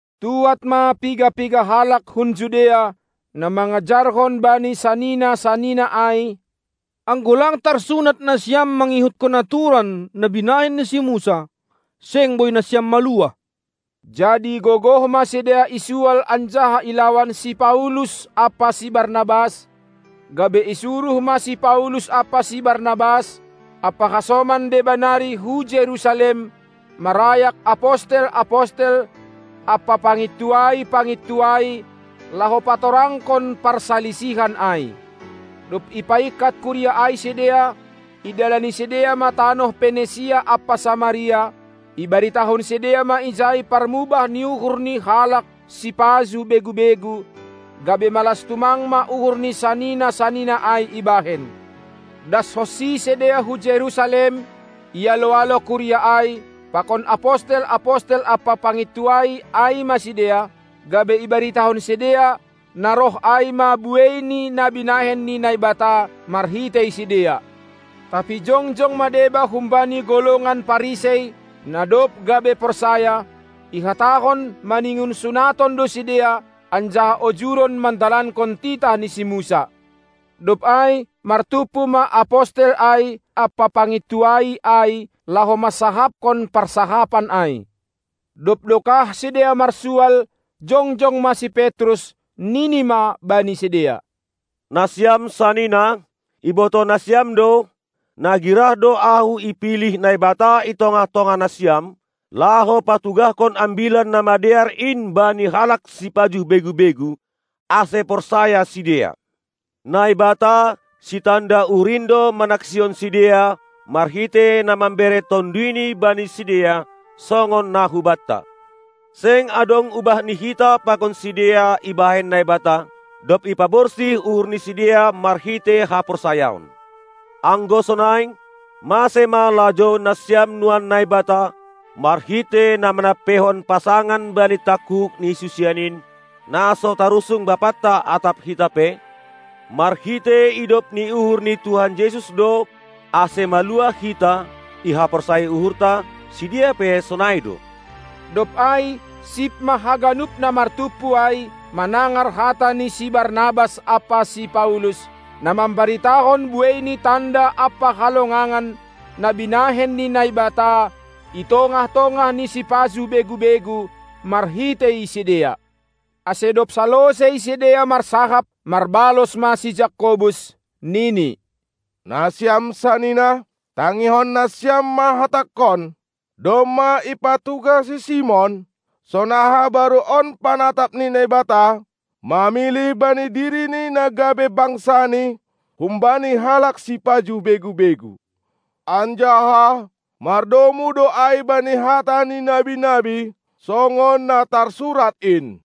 Tuad ma piga-piga halak hun Judea, na mangajarhon bani sanina-sanina ai: Anggo lang tarsunat nasiam mangihuthon aturan, na binahen ni si Musa, seng boi nasiam maluah. Jadi gogoh ma sidea isual anjaha ilawan si Paulus ampa si Barnabas, gabe isuruh ma si Paulus ampa si Barnabas ampa hasoman deba nari hu Jerusalem marayak apostel-apostel ampa pangintuai-pangintuai, laho patorangkon parsalisihan ai. Dob ipaingkat kuria ai sidea, idalani sidea ma tanoh Penisia ampa Samaria, ibaritahon sidea ma ijai parmubah ni uhur ni halak sipajuh begu-begu, gabe malas tumang ma uhur ni sanina-sanina ai ibahen. Das honsi sidea hu Jerusalem, ialo-alo kuria ai, pakon apostel-apostel ampa pangintuai ai ma sidea, gabe ibaritahon sidea na roh ai ma buei ni na binahen ni Naibata marhitei sidea. Tapi jongjong ma deba humbani golongan Parisei, na dob gabe porsaya, ihatahon maningon sunaton do sidea anjaha ojuron mandalankon titah ni si Musa. Dob ai martumpu ma apostel ai ampa pangintuai ai laho mansahapkon parsahapan ai. Dob dokah sidea marsual, jongjong ma si Petrus, nini ma bani sidea: Nasiam sanina, ibotoh nasiam do, na girah do ahu ipilih Naibata i tongah-tongah nasiam, laho patugahkon Ambilan Namadear in bani halak sipajuh begu-begu, ase porsaya sidea. Naibata, sitanda uhur in do manaksihon sidea marhitei na mambere TonduyNi bani sidea, songon na hubanta. Seng adong ubah ni hita pakon sidea ibahen Naibata, dob ipaborsih uhur ni sidea marhitei haporsayaon. Anggo sonai, mase ma lajouon nasiam nuan Naibata, marhitei na manampeihon pasangan bani tangkuhuk ni susian in, na so tarusung bapanta atap hita pe? Marhitei idop ni uhur ni Tuhan Jesus do, ase maluah hita ihaporsayai uhurta; sidea pe sonai do. Dob ai sip ma haganup na martumpu ai, manangar hata ni si Barnabas ampa si Paulus, na mambaritahon buei ni tanda ampa halongangan na binahen ni Naibata i tongah-tongah ni sipajuh begu-begu marhitei sidea. Ase dob salosei sidea marsahap, marbalos ma si Jakobus, nini: Nasiam sanina, tangihon nasiam ma hatangkon! Domma ipatugah si Simon, sonaha baru on panatap ni Naibata, mamilih bani dirini na gabe bangsani humbani halak sipajuh begu-begu. Anjaha mardomu do ai bani hata ni nabi-nabi, songon na tarsurat in: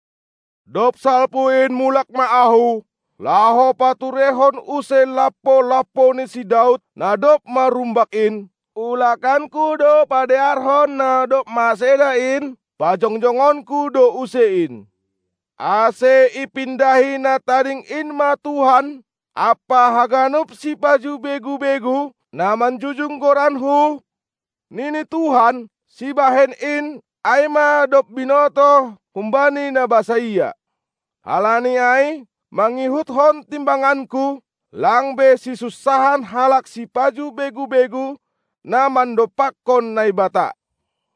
Dob salpu in mulak ma Ahu, laho patureihon use lampo-lampo ni si Daud na dob marumbak in; ulakanKu do padearhon na dob maseda in, pajongjongonKu do use in, ase ipindahi na tading in ma Tuhan, ampa haganup sipajuh begu-begu, na manjujung goranKu, nini Tuhan, sibahen in, ai ma dob binotoh humbani na basaia. Halani ai, mangihutkon timbanganku, lang be sisunsahan halak sipajuh begu-begu na mandompakkon Naibata.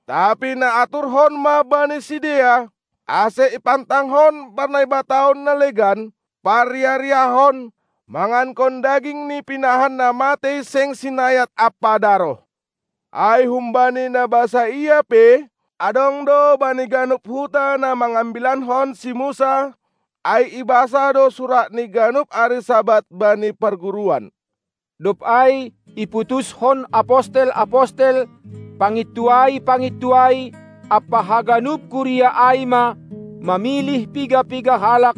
Tapi naaturhon ma bani sidea, ase ipantangkon ma parnaibataon na legan, parriah-riahon, mangankon daging ni pinahan na matei seng sinayat ampa daroh. Ai humbani na basaia pe adong do bani ganup huta na mangambilankon si Musa, ai ibasa do suratni ganup ari Sabat bani parguruan. Dob ai iputushon apostel-apostel, pangintuai-pangintuai ampa haganup kuria ai ma mamilih piga-piga halak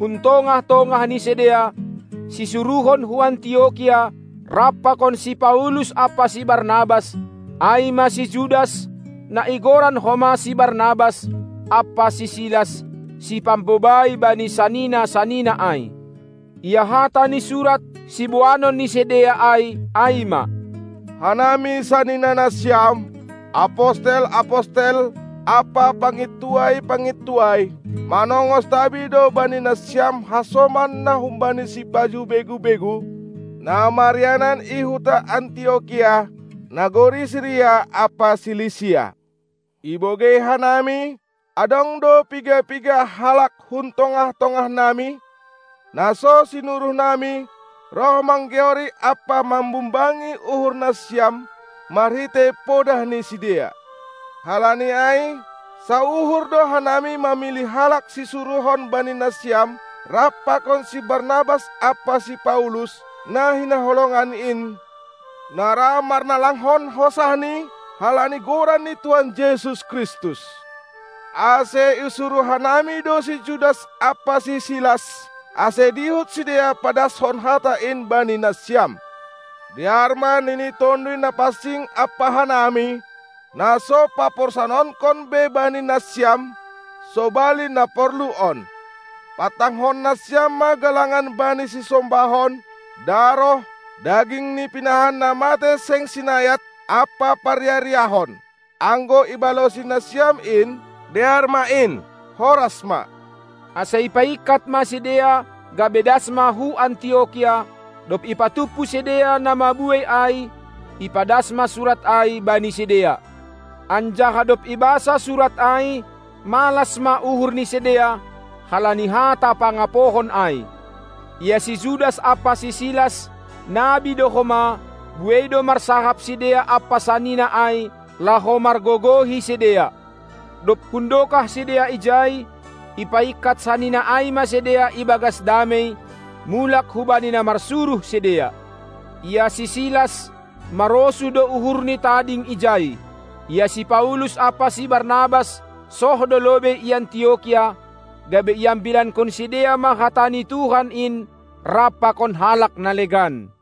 hun tongah-tongah ni sidea, sisuruhon hu Antiokia rap pakon si Paulus ampa si Barnabas, ai ma si Judas, na igoran homa si Barnabas, ampa si Silas, si pambobai bani sanina-sanina ai. Ia hata ni surat, siboanon ni sidea ai, ai ma: Hanami saninanasiam, apostel-apostel ampa pangintuai-pangintuai, manongos tabi do bani nasiam hasoman na humbani sipajuh begu-begu, na marianan i huta Antiokia, nagori Siria ampa Silisia. Ibogei hanami, adong do piga-piga halak hun tongah-tongahnami, na so sinuruhnami, roh manggeori ampa mambumbangi uhurnasiam marhitei podah ni sidea. Halani ai sauhur do hanami mamilih halak sisuruhon bani nasiam rap pakon si Barnabas ampa si Paulus, na hinaholongan in, na ra marnalangkon hosahni halani Goran ni Tuhan Jesus Kristus. Ase isuruh hanami do si Judas ampa si Silas, ase dihut sidea padashon hata in bani nasiam. Dear ma nini Tonduy Napansing ampa hanami, na so paporsanonkon be bani nasiam, sobali na porlu on: Pantangkon nasiam ma galangan bani sisombahon, daroh, daging ni pinahan na matei seng sinayat ampa parriah-riahon. Anggo ibalosi nasiam in, dear ma in. Horas ma! Ase ipaingkat ma sidea, gabe das ma hu Antiokia; dob ipatumpu sidea na mabuei ai, ipadas ma surat ai bani sidea. Anjaha dob ibasa surat ai, malas ma uhur ni sidea, halani hata pangapohon ai. Ia si Judas ampa si Silas, nabi do homa; buei do marsahap sidea ampa sanina ai, laho margogohi sidea. Dob hundokah sidea ijai, ipaingkat sanina ai ma sidea ibagas damei, mulak hubani na marsuruh sidea. Ia si Silas, marosuh do uhurni tading ijai. Ia si Paulus ampa si Barnabas soh do lobei i Antiokia, gabe iambilankon sidea ma hata ni Tuhan in rap pakon halak na legan.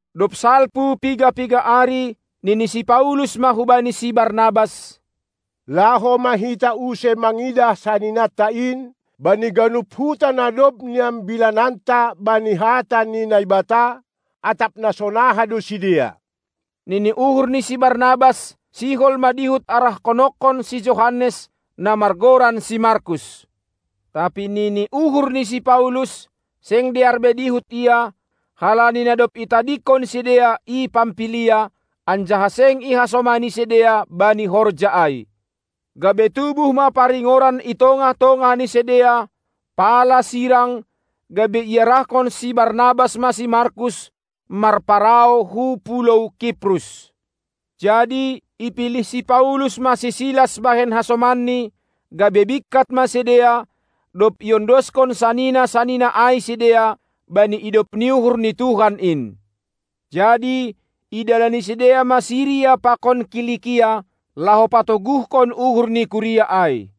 Dob salpu piga-piga ari, nini si Paulus ma hubani si Barnabas: Laho ma hita use mangidah saninanta in, bani ganup huta na dob niambilananta bani hata ni Naibata, atap na sonaha do sidea. Nini uhur ni si Barnabas, sihol ma dihut arahkononkon si Johannes, na margoran si Markus. Tapi nini uhur ni si Paulus, seng dear be dihut ia, halani na dob itadingkon sidea i Pampilia, anjaha seng ihasomani sidea bani horja ai. Gabe tubuh ma paringoran i tongah-tongah ni sidea, pala sirang, gabe iarahkon si Barnabas ma si Markus marparau hu pulou Kiprus. Jadi ipilih si Paulus ma si Silas bahen hasomanni, gabe bingkat ma sidea, dob iondoskon sanina-sanina ai sidea, bani idop ni uhur ni Tuhan in. Jadi idalani sidea ma Siria pakon Kilikia, laho patoguhkon uhur ni kuria ai.